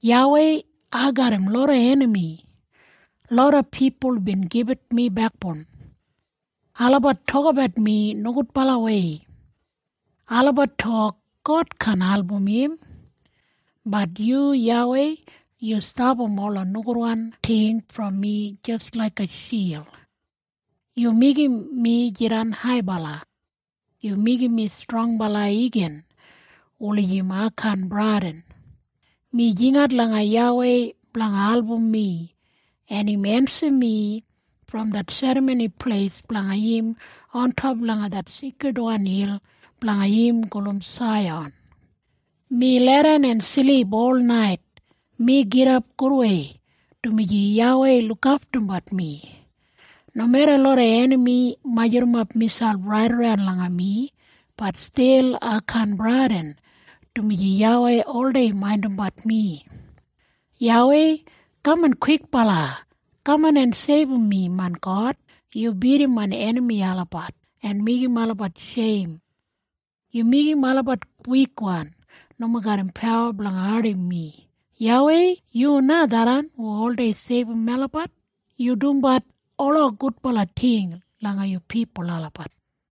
YAWEI, ai garram loda enami. Loda pipul bin gibit mi bekboun. Olabat tokabat mi nogudbalawei. Olabat tok, “God kaan album im.” Bat yu YAWEI, yu stapam ola nogudwan ting brom mi jis laiga shild. Yu meigim mi jidan haibala. Yu meigim mi strongbala igin, wulijim ai kaan bradin. Mi jingat langa YAWEI blanga album mi, en im ensim mi brom det serramoni pleis blanga im, ontop langa det seikridwan hil blanga im gulum Saiyan. Mi leidan en silip ol nait. Mi gidap gudwei, dumaji YAWEI lukaftumbat mi. Nomeda loda enami majurrumap miselp raidaran langa mi, bat stil ai kaan bradin, dumaji YAWEI oldei maindimbat mi. “YAWEI, kaman kwikbala! Kaman en seibum mi, main God! Yu bidim main enami olabat, en meigim olabat sheim. Yu meigim olabat wikwan, nomo garram pawa blanga ardim mi.” YAWEI, yu na tharran hu oldei seibum melabat. Yu dumbat ola gudbala ting langa yu pipul olabat.